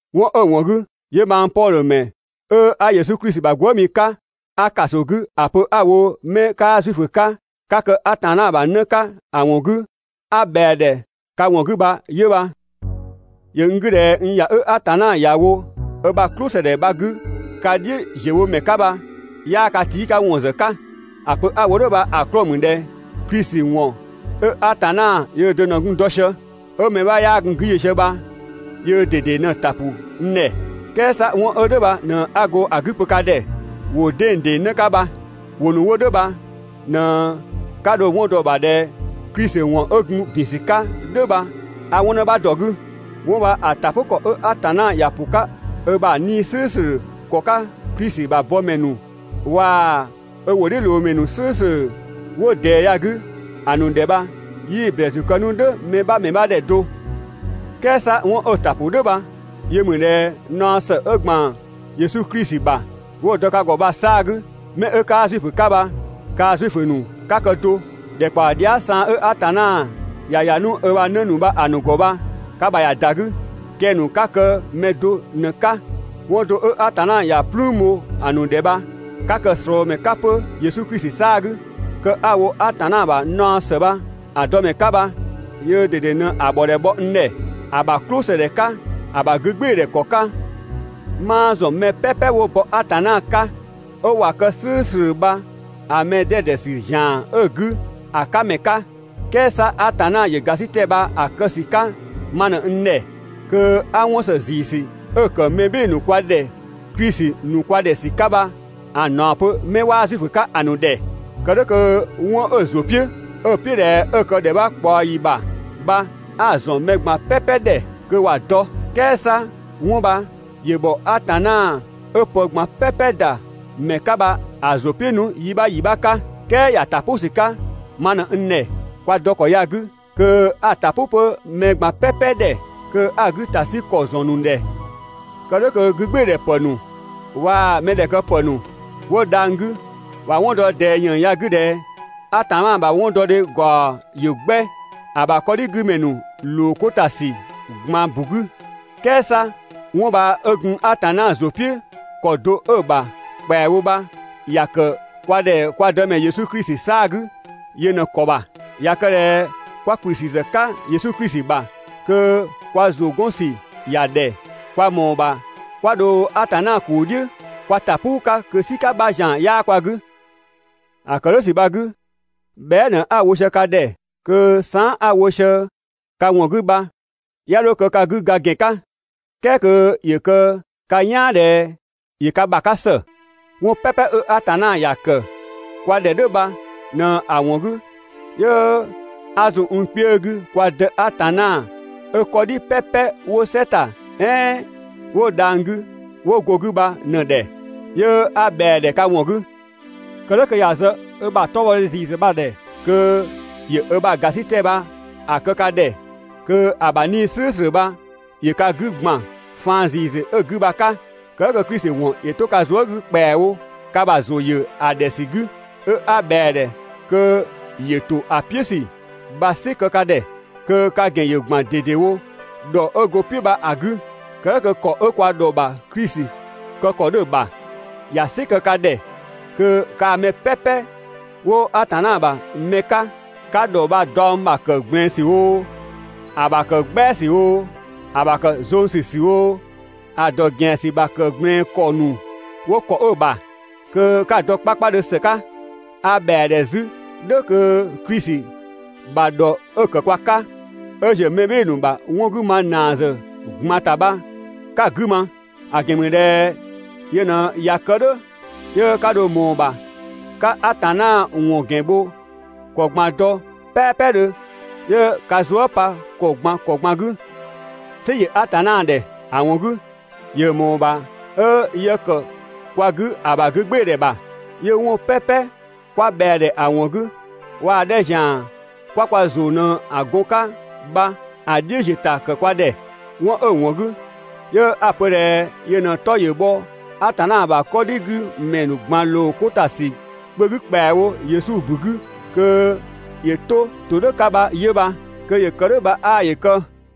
'Wɔn 'ö‑ ‑wɔn 'gü 'yö mang Pɔdhö ‑mɛ 'ö 'a Yesu Klisi ‑bha gwëëmi 'ka, 'a ‑kaso 'gü ‑a pö 'a‑ wo 'mɛ 'kaa Zuifö 'ka 'ka kë Atanna ‑bha 'në 'ka ‑a ‑wɔn 'gü, 'a ꞊bhɛa‑ ‑dhɛ ka ‑wɔn 'gü bha 'yö bha. ‑Yö n 'gü ꞊dhɛ n ‑ya 'ö Atanna ‑ya wo ö ‑bha "klʋsëdhɛ bha‑ 'gü ka "dhiʋ̈ ‑ziö wo ‑mɛ 'ka bha, 'yaa ka tii' 'ka ‑wɔn ‑zë 'ka. ‑A pö 'a‑ wo "dhʋ̈ bha‑ 'klɔɔ‑ ‑mü ꞊dhɛ Klisi ‑wɔn 'ö Atanna yöö do ꞊në gun‑ dɔ sië, 'ö mɛ 'bha 'yaa gun‑ 'gü yö sië bha, yöö ꞊dede ꞊në‑ ‑ta ‑pʋ n ‑dhɛ. "Kɛɛ 'sa 'wɔn 'ö "dhʋ̈ bha ꞊në 'a go‑ 'gü pö ka ‑dhɛ ‑wʋ 'dengdeng 'në 'ka bha. ‑Wʋ ‑nu 'wo "dhʋ̈ bha ꞊në 'ka dho‑ 'wɔn dɔ‑ ‑bha ꞊dhɛ Klisi ‑wɔn 'ö gun ‑bin ‑sü 'ka "dhʋ̈ bha a 'wɔn 'në bha ‑dɔ 'gü. 'Wɔn bha‑ ‑ta "pʋ ‑kɔ 'ö Atanna ‑ya ‑pʋ 'ka ö ‑bha 'Nii‑ "slʋ̈ʋ̈slʋ̈ ‑kɔ 'ka Klisi ‑bha bɔmɛ ‑nu waa‑ ö ‑wʋdhiʋ̈loomɛ ‑nu "slʋ̈ʋ̈slʋ̈ 'wo ꞊dɛɛ ya‑ 'gü ‑a ‑nu ‑dhɛ bha 'yii‑ ‑blɛɛsü kë 'nu "dhʋ̈ mɛ 'bha ‑mɛ 'bha ‑dhɛ do. "Kɛɛ 'sa 'wɔn 'ö‑ ‑ta ‑pʋ "dhʋ̈ bha yö ‑mü ꞊dhɛ naɔ ‑së 'ö ‑gban Yesu Klisi ‑bha 'wo‑ dɔ ka ‑gɔ bha‑ 'saa‑ 'gü, 'mɛ 'ö 'kaa Zuifö 'ka bha, kaa Zuifö ‑nu 'ka kë do, ‑dhɛkpaɔ dhia" saan 'ö Atanna ‑ya ‑ya 'nu ö ‑bha 'në ‑nu bha‑ ‑nu ‑gɔ bha ka ‑bha ꞊ya ‑da 'gü, kɛng‑ ‑nu 'ka kë mɛ do ꞊në‑ 'ka. 'Wɔn do 'ö Atanna ‑ya "plüün bho‑ ‑nu ‑dhɛ bha, 'ka kë‑ ꞊slɔɔmɛ 'ka 'pö Yesu Klisi 'saa‑ 'gü. Kë 'a‑ wo Atanna ‑bha naɔ ‑së bha‑ dɔ ‑mɛ 'ka bha, yöö ꞊dede ꞊në‑ ‑bhɔdhɛ bhɔ n ‑dhɛ ‑a ‑bha "klʋsëdhɛ 'ka ‑a ‑bha 'gügbɩɩdhɛ ‑kɔ 'ka. 'Maa ‑zɔn mɛ "pɛpɛ 'wo bɔ Atanna 'ka 'ö ꞊wa kë "slʋ̈ʋ̈slʋ̈ bha‑ mɛ 'dɛdɛ ‑sü ‑zian 'ö‑ 'gü ‑a 'ka ‑mɛ 'ka, "kɛɛ 'sa Atanna ‑yö ‑gasitɛ bha‑ kë ‑sü 'ka ma ꞊në n ‑dhɛ kö 'a 'wɔn ‑së ‑ziisü 'ö‑ ‑kë mɛ "bhɩɩ‑ ‑nu kwa ‑dhɛ Klisi ‑nu kwa ‑dhɛ ‑sü 'ka bha‑ ‑naɔ ‑pö 'mɛ 'waa Zuifö 'ka ‑a ‑nu ‑dhɛ. Kë "dhʋ̈ kö 'wɔn 'ö‑ ‑zʋ "piʋ̈, 'ö‑ "piʋ̈ ꞊dhɛ 'ö‑ kë ‑dhɛ 'bha ꞊kpaɔ ‑yi ‑bha bha 'a‑ ‑zɔn mɛ ꞊gban "pɛpɛ ‑dhɛ kö ‑wa dɔ. "Kɛɛ 'sa 'wɔn bha ‑yö ‑bhɔ Atanna 'ö pë ꞊gban "pɛpɛ ‑da ‑mɛ 'ka bha‑ ‑zʋ "piʋ̈ 'nu yi 'bha ‑yi 'bha 'ka, "kɛɛ ‑ya ‑ta "pʋ ‑sü 'ka ma ꞊në n ‑dhɛ kwa dɔ ‑kɔ ya‑ 'gü kö 'a‑ ‑ta "pʋ 'pö mɛ ꞊gban "pɛpɛ ‑dhɛ kö 'a‑ 'gü ‑ta 'sü ‑kɔ ‑zɔn ‑nu ‑dhɛ. Kë "dhʋ̈ kö 'gügbɩɩdhɛpë ‑nu waa‑ mɛdhɛkëpë ‑nu 'wo dhang‑ 'gü ‑wa 'wɔn dɔ ꞊dɛɛ ‑yën ya‑ 'gü ꞊dhɛ Atanna ‑bha 'wɔndɔdhe bha‑ ‑gaɔ ‑yö 'gbɛ ‑a ‑bha 'kɔdhigümɛ ‑nu ‑loo 'ko ‑ta ‑sü ꞊gban ‑bu 'gü. "Kɛɛ 'sa 'wɔn bha 'ö gun Atanna ‑zʋ "piʋ̈ ‑kɔ do 'ö‑ ‑bha ‑kpɛawo bha ‑ya ‑kë kwa ‑dhɛ kwa Dëmɛ Yesu Klisi 'saa‑ 'gü yö ꞊në‑ ‑kɔ ‑bha. ꞊Ya kë ꞊dhɛ 'kwa ‑kplü ‑sü ‑zë 'ka Yesu Klisi bha, kö kwa ‑zʋ 'gɔn ‑sü ‑ya ‑dhɛ, kwa ‑mɔɔ ‑bha 'kwa dho Atanna ‑kuu "dhiʋ̈ kwa ‑ta "puu 'ka kö "sika 'bha ‑zian 'yaa kwa 'gü. ‑A ‑kë "dhʋ̈ ‑sü bha‑ 'gü, bhɛa" ꞊në 'a‑ wo sië ka ‑dhɛ kö saan" 'a‑ wo sië ka ‑wɔn 'gü bha 'ya 'dho kë ka 'gü ga ‑gɛn 'ka, "kɛɛ kö ‑yö kë ka "yaan ꞊dhɛ ‑yö ka ‑bha 'ka ‑së. 'Wɔn "pɛpɛ 'ö Atanna ‑ya ‑kë kwa ‑dhɛ "dhʋ̈ bha ꞊në‑ ‑wɔn 'gü 'yö 'a zun n kpiö 'gü kwa Dë Atanna 'ö 'kɔdhi "pɛpɛ 'wo "sɛ ‑ta "ɛɛn 'wo dhang‑ 'gü 'wo go‑ 'gü bha‑ ‑dhɛ, 'yö 'a ꞊bhɛa‑ ‑dhɛ ka ‑wɔn 'gü. Kë "dhʋ̈ kö ‑ya zë ö ‑bha 'tɔbhɔdhe ‑ziisü bha ‑dhɛ kö ‑yö ö ‑bha ‑gasitɛ bha‑ kë ka ‑dhɛ kö ‑a ‑bha 'Nii‑ "slʋ̈ʋ̈slʋ̈ bha ‑yö ka 'gü ‑gban faan ‑ziisü 'ö‑ 'gü bha‑ 'ka, kë "dhʋ̈ kö Klisi ‑wɔn ‑yö 'to ka zuë" 'gü ‑kpɛawo ka ‑bha ‑zʋ ‑yö ‑a ‑dhɛ ‑sü 'gü. 'Ö 'a ꞊bhɛa‑ ‑dhɛ kö ‑yö ‑to ‑a "piʋ̈ ‑sü bha‑ "sɩ kë ka ‑dhɛ, kö ka ‑gɛn ‑yö ‑gban ꞊dedewo ‑dhɔ 'ö go‑ "piʋ̈ bha‑ 'gü, kë "dhʋ̈ kö ‑kɔ 'ö kwa ‑dhɔ ‑bha Klisi kë ‑kɔ 'dhö‑ ‑bha, ‑ya "sɩ kë ka ‑dhɛ kö kaa‑ mɛ "pɛpɛ 'wo Atanna ‑bha mɛ 'ka 'ka ‑dhɔ bha‑ daɔng ‑bha ‑kë ꞊gblɛɛn ‑sü oo, ‑a ‑bha ‑kë "gbɛa ‑sü oo, ‑a ‑bha ‑kë zong ‑sü ‑sü oo ‑a ‑dɔ ‑gɛan ‑sü ‑bha ‑kë ꞊gblɛɛn ‑kɔ ‑nu 'wo ‑kɔ 'ö‑ ‑bha, kö 'ka‑ dɔ 'kpakpadhö ‑së 'ka. A ‑bhɛa ‑dhɛ 'zü "dhʋ̈ kö Klisi ‑bha ‑dhɔ 'ö‑ ‑kë kwa 'ka, 'ö ‑ziö mɛ "bhɩɩ‑ ‑nu ‑bha 'wɔn 'gü ma ‑naa ‑zë ꞊gban ‑ta bha 'ka‑ 'gü ma, ‑a ‑gɛn ‑mü ꞊dhɛ yö ꞊në ꞊ya kë "dhʋ̈ 'yö 'ka dho ꞊mɔɔ‑ ‑bha 'ka Atanna ‑wɔn ‑gɛn bho ‑kɔ ꞊gban dɔ "pɛpɛdhö 'yö ka zuë" pa ‑kɔ ꞊gban ‑kɔ ꞊gban 'gü. "Sɩ ‑yö Atanna ‑dhɛ, ‑a ‑wɔn 'gü ‑yö ‑mɔɔ ‑bha 'ö yë ‑kë kwa 'gü ö ‑bha 'gügbɩɩdhɛ ‑bha, 'yö 'wɔn "pɛpɛ 'kwa ꞊bhɛa‑ ‑dhɛ ‑a ‑wɔn 'gü, waa‑ 'dhɛ ‑zian 'kwa kwa ‑zʋ ꞊në‑ gɔn‑ 'ka bha 'ö‑ "dhiʋ̈ ‑ziö ‑ta ‑kë kwa ‑dhɛ. 'Wɔn 'ö‑ ‑wɔn 'gü 'yö 'a‑ pö ꞊dhɛ yö ꞊në‑ 'tɔ ‑yö bhɔ Atanna ‑bha 'kɔdhigümɛ ꞊gban ‑loo 'ko ‑ta ‑sü kpö 'gü ‑kpɛawo Yesu ‑bu 'gü kö ‑yö 'to‑ 'to ‑kɔ 'ka bha 'yö bha. Kö ‑yö kë "dhʋ̈ bha 'aa ‑yö kë!